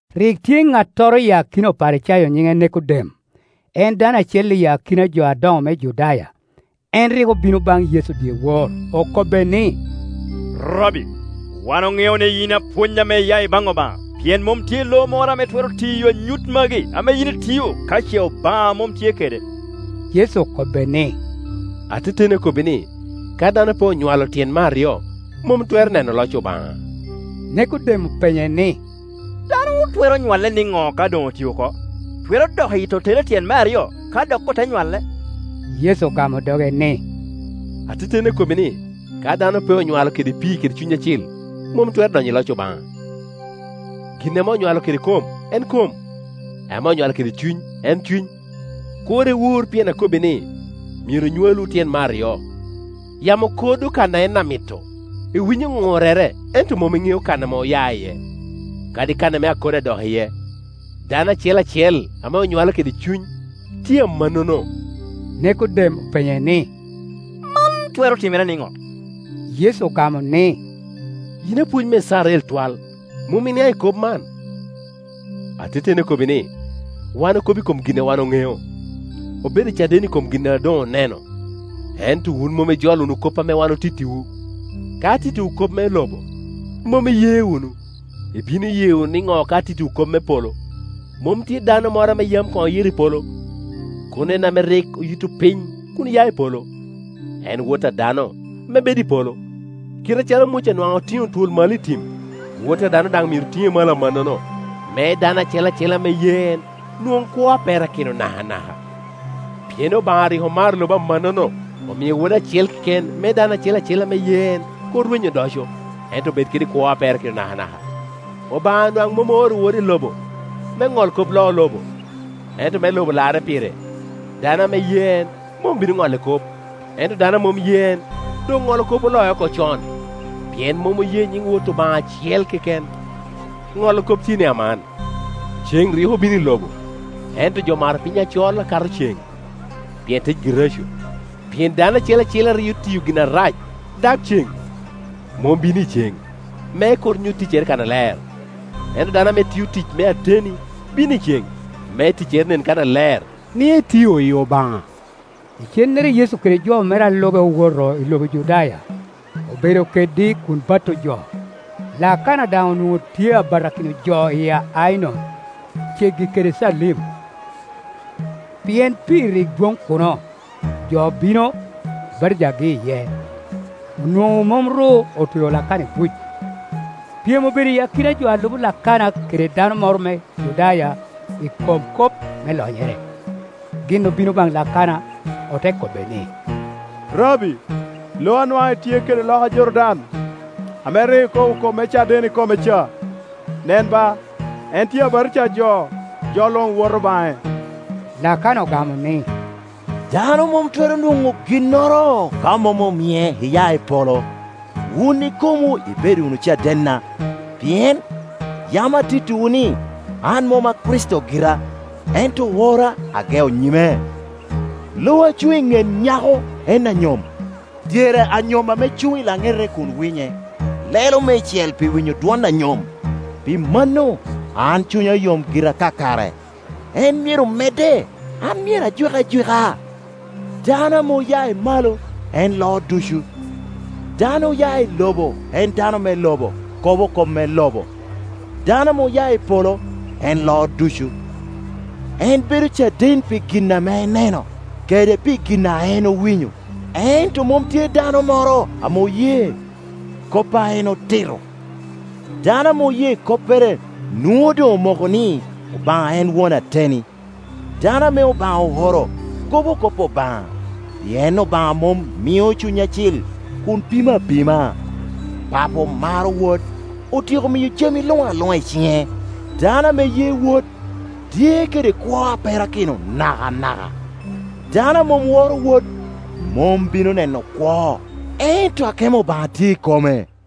Rik tye Ċ‹attoro i akina Oparicayo nyiĊ‹e Nekodem, en dano acel i akina jo adoĊ‹o me Judaya. En rik obino baĊ‹ Yecu dyewor, okobbe ni, “Rabbi, wan oĊ‹eo ni yin apwony ame iya i baĊ‹ ObaĊ‹a; pien mom tye lo moro ame twero tiyo anyut magi ame yin itio ka ce ObaĊ‹a mom tye kede.” Yecu okobbe ni, “Ateteni akobbi ni, ka dano pe onywalo tyen me aryo, mom twero neno loc ObaĊ‹a.” Nikodem openye ni, “Dano twero nywalle niĊ‹o ka doĊ‹ oti oko? Twero dok i yi tottere tyen me aryo, ka dok ote nywale?” Yecu ogamo doge ni, “Ateteni akobbi ni, ka dano pe onywalo kede pii kede Cuny Acil, mom twero donyo i loc ObaĊ‹a. Gin ame onywalo kede kom en kom, ame onywalo kede Cuny en cuny. Kur iwur pien akobbi ni, ‘Myero nywalwu tyen me aryo.’ Yamo kodo kan a en amito, iwinyo Ċ‹urrere, ento mom iĊ‹eo kan ame oya iye, kadi kan ame akodo adok iye; dano acel acel ame onywalo kede Cuny tye amannono.” Nekodem openye ni, “Man twero timere niĊ‹o?” Yecu ogamo ni, “Yin apwony me Icrael twal, mom iniaĊ‹ i kop man? Ateteni akobbi ni, wan okobo i kom gin a wan oĊ‹eo, obedo caden i kom gin a doĊ‹ oneno, ento wun mom ijolo wunu kop ame wan otittiwu. Ka atittiwu kop me lobo, mom iye wunu, ibino ye wunu niĊ‹o ka atittiwu kop me polo? Mom tye dano moro ame yam koĊ‹ oyito i polo, kono en ame rik oyitto piny kun oya i polo, en Wot a dano, ame bedo i polo. Kit acalo Muca nwaĊ‹ otiĊ‹o twol malo i tim, Wot a dano daĊ‹ myero tiĊ‹e malo amannono me dano acel acel ame ye en nwoĊ‹ kwo a perakino nakanaka.” Pien ObaĊ‹a rik omaro lobo amannono, omio Wode acel keken, me dano acel acel ame ye en kur rweny odoco, ento bed kede kwo a perakino nakanaka. ObaĊ‹a nwaĊ‹ mom ooro Wode i lobo me Ċ‹ol kop loo lobo, ento me lobo larre pire. Dano ame ye en mom obino Ċ‹olle kop, ento dano a mom ye en doĊ‹oĊ‹olo kop oloe oko con; pien mom oye nyiĊ‹ Wot ObaĊ‹a acel keken. ĊŠolo kop tye ni aman, ceĊ‹ rik obino i lobo, ento jo omaro piny acol akato ceĊ‹, pien ticgi reco. Pien dano acel acel a rio tiyo gin arac dag ceĊ‹, mom bino i ceĊ‹, me kur nyut ticcere kannaler. Ento dano ame tio tic me ateni bino i ceĊ‹, me ticcere nen kannaler, ni etio i ObaĊ‹a. Icennere Yecu kede jo mere a lube owoto i lobo Judaya; obedo kedgi kun bato jo. Lakana daĊ‹ onwoĊ‹o tye a batakino jo i Ainon, ceggi kede Calim, pien pii rik dwoĊ‹ kuno, jo obino, obatijagi iye. OnwoĊ‹o mom ru otweo Lakana i buc. Pyem obedo i akina jo a lubo Lakana kede dano moro me Judaya i kom kop me lonyere. Gin obino baĊ‹ Lakana ote kobbe ni, “Rabbi, lo a nwaĊ‹ itye kede loka Jordan, ame rik ikobo kop me caden i kome ca, nen ba, en tye abatija jo, jo luĊ‹ woto baĊ‹e.” Lakana ogamo ni, “Dano mom twero nwoĊ‹o ginnoro ka mom omie iya i polo. Wun ikomwu ibedo wunu cadenna, pien yam atittiwu ni, ‘An mom a Kricito gira, ento oora ageo nyime.’ Lo a cuĊ‹ i Ċ‹et nyako en anyom; dyere anyom ame cuĊ‹ i laĊ‹ete kun winye, lelo meicel pi winyo dwon anyom; pi mano an cunya yom gira kakare. En myero medde, an myero ajwik ajwika.” Dano ame oya i malo en loo ducu; dano oya i lobo en dano me lobo, kobo kop me lobo; dano ame oya i polo, en loo ducu. En bedo caden pi gin ame eneno kede pi gin a en owinyo, ento mom tye dano moro ame oye kop a en otito. Dano ame oye koppere nwoĊ‹o doĊ‹ omoko ni ObaĊ‹a en won ateni. Dano ame ObaĊ‹a ooro kobo kop ObaĊ‹a, pien ObaĊ‹a mom mio Cuny Acil kun pimo apima. Papo maro Wod, otyeko miyo jami luĊ‹ aluĊ‹a i ciĊ‹e. Dano ame ye Wod, tye kede kwo a perakino nakanaka; dano a mom woro Wod, mom bino neno kwo, ento akemo ObaĊ‹a tye i kome.